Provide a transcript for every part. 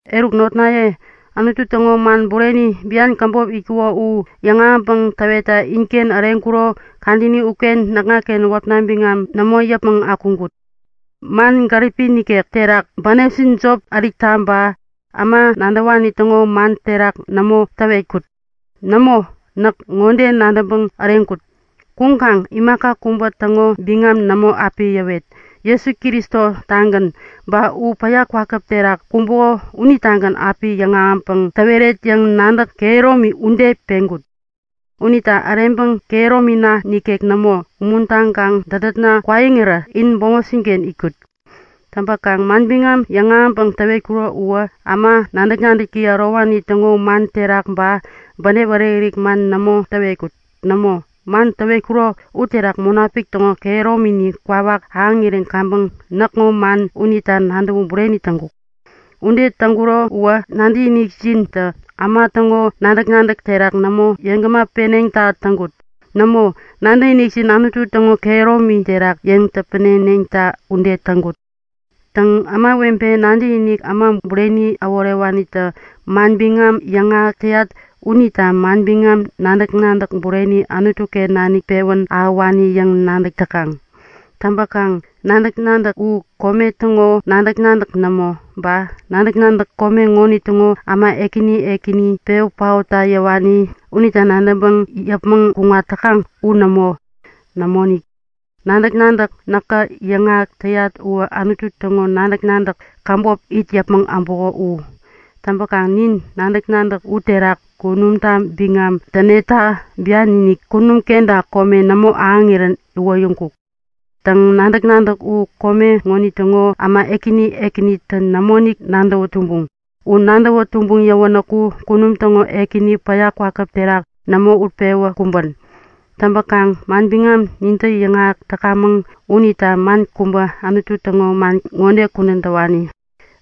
Eruk notnaye, Anutu täŋo man bureni, bian käbop itkuko u yäŋahäŋpäŋ täwetta inken äreŋkuro kadäni uken näkŋaken wäpna biŋam nämo yäpmäŋ akuŋkut. Man gäripi nikek terak, bänepjin jop ärikta ba äma nadäwani täŋo man terak nämo täwetkut. Nämo, näk ŋode nadäŋpäŋ äreŋkut; Kuŋkaŋ imaka kubä täŋo biŋam nämo api yäwet. Jesu Kristo-tagän, ba u päya kwakäp terak kumbuko unitagän api yäŋahäŋpäŋ täweret yäŋ nadäk kehäromi ude peŋkut. Unita äreŋpäŋ kehäromina nikek nämo, umuntaŋkaŋ dädätna kwaiŋirä in bämopjin-ken itkut. Täŋpäkaŋ manbiŋam yäŋahäŋpäŋ täwetkuro uwä äma nadäk-nadäki ärowani täŋo man terak, ba bänep ärik-ärik man nämo täwetkut. Nämo, man täwetkuro uterak Munapik täŋo kehäromini kwawak ahäŋirän kaŋpäŋ näkŋo man unita nadäwä bureni täŋkuk. Ude täŋkuro uwä nadäkinikjintä äma täŋo nadäk-nadäk terak nämo yeŋgämä peneŋta täŋkut. Nämo, nadäkinikjin Anutu täŋo kehäromi terak yeŋ täpäneneŋta ude täŋkut. Täŋ, ämawebe nadäkiniki äma bureni äworewanitä manbiŋam yäŋahäk täyat unita manbiŋam nadäk-nadäk bureni Anutu-ken nanik pewän ahäwani yäŋ nadäk täkaŋ. Täŋpäkaŋ nadäk-nadäk u kome täŋo nadäk-nadäk nämo, ba nadäk-nadäk kome ŋonitäŋo äma ekäni ekäni, pewä paotta yäwani unitä nadäŋpäŋ yäpmäŋ kuŋat täkaŋ u nämo. Nämoinik, nadäk-nadäk näkä yäŋahäk täyat uwä Anutu täŋo nadäk-nadäk käbop it yäpmäŋ äbuko u. Täŋpäkaŋ nin nadäk-nadäk uterak kunumta biŋam täneta bian-inik, kunum kenta kome nämo ahäŋirän iwoyäŋkuk. Täŋ, nadäk-nadäk u kome ŋonitäŋo äma ekäni ekänitä nämoinik nadäwä tumbuŋ. U nadäwä tumbuŋ yäwänäku kunum täŋo Ekäni päya kwakäp terak nämo utpewä kumbän. Täŋpäkaŋ manbiŋam nintä yäŋahäk täkamäŋ unita man kubä Anutu täŋo man ŋode kudän täwani;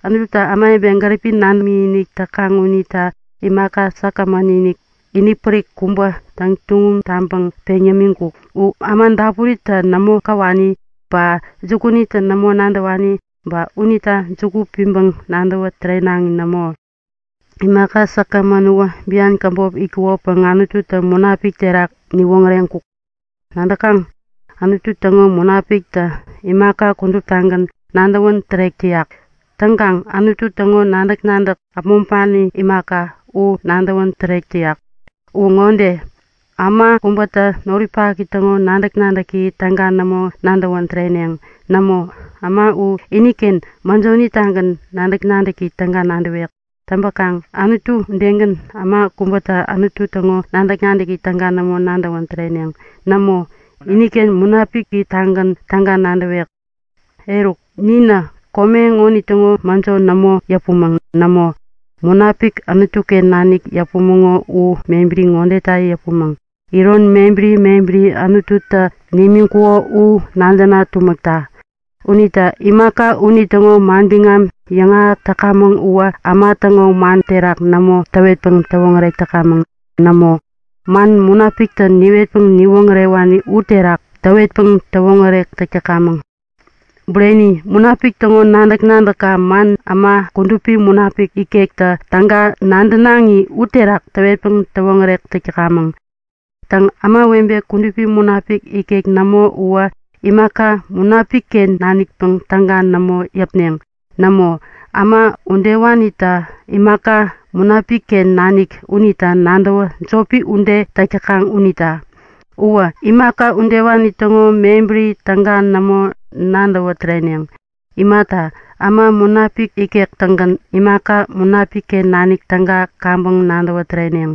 Anututä ämawebe gäripi nadäŋ imik täkaŋ unita imaka säkgämän-inik, inipärik kubä täŋtuŋum taŋpäŋ peŋ yämiŋkuk. U äma dapuritä nämo käwani, ba jukunitä nämo nadäwani, ba unita juku piŋpäŋ nadäwä tärenaŋi nämo. Imaka säkgämän uwä bian käbop itkukopäŋ Anututä Munapiki terak niwoŋäreŋkuk. Nadäkaŋ, Anutu täŋo Munapikitä imaka kuduptagän nadäwän tärek täyak. Täŋkaŋ Anutu täŋo nadäk-nadäk äpmoŋpani imaka, nadäwän tärek täyak. Uwä ŋode; Äma kubätä noripaki täŋo nadäk-nadäki täga nämo nadäwän täreneŋ. Nämo, äma u iniken mäjoni-tägän nadäk-nadäki täga nadäwek. Täŋpäkaŋ Anutu udegän, äma kubätä Anutu täŋo nadäk-nadäki täga nämo nadäwän täreneŋ. Nämo, iniken Munapiki-tägän täga nadäwek. Eruk, ninä kome ŋonitäŋo mäjo nämo yäpumäŋ. Nämo, Munapik Anutu-ken nanik yäpumäŋo u mebäri ŋodeta yäpumäŋ; Iron mebäri mebäri Anututä nimiŋkuko u nadäna tumäkta. Unita imaka unitäŋo manbiŋam yäŋahäk täkamäŋ uwä äma täŋo man terak nämo täwetpäŋ täwoŋärek täkamäŋ. Nämo, man Munapiktä niwetpäŋ niwoŋärewani uterak täwetpäŋ täwoŋärek täk täkamäŋ. Bureni, Munapik täŋo nadäk-nadäkä man äma Kudupi Munapik ikektä täga nadänaŋi uterak täwetpäŋ täwoŋärek täk täkamäŋ. Täŋ, ämawebe Kudupi Munapik ikek nämo uwä imaka Munapik-ken nanikpäŋ täga nämo yäpneŋ. Nämo, äma udewanitä imaka Munapik-ken nanik unita nadäwä jopi ude täk täkaŋ unita. Ba imaka udewani täŋo mebäri täga nämo nadäwä täreneŋ. Imata, äma Munapik ikek-tägän imaka Munapik-ken nanik täga kaŋpäŋ nadäwä täreneŋ.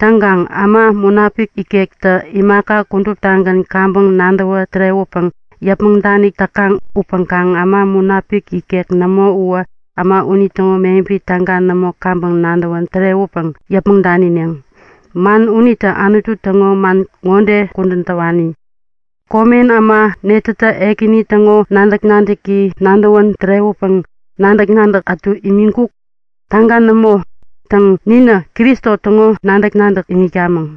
Täŋkaŋ äma Munapik ikektä imaka kuduptagän kaŋpäŋ nadäwä tärewäpäŋ yäpmäŋ danik täkaŋ upäŋkaŋ äma Munapik ikek nämo uwä äma unitäŋo mebäri täga nämo kaŋpäŋ nadäwä tärewäpäŋ yäpmäŋ danineŋ. Man unita Anutu täŋo man ŋode kudän täwani; Komen äma netätä Ekäni täŋo nadäk-nadäki nadäwän tärewäpäŋ nadäk-nadäk ätu imiŋkuk? Täga nämo! Täŋ, ninä Kristo täŋo nadäk-nadäk iŋitkamäŋ.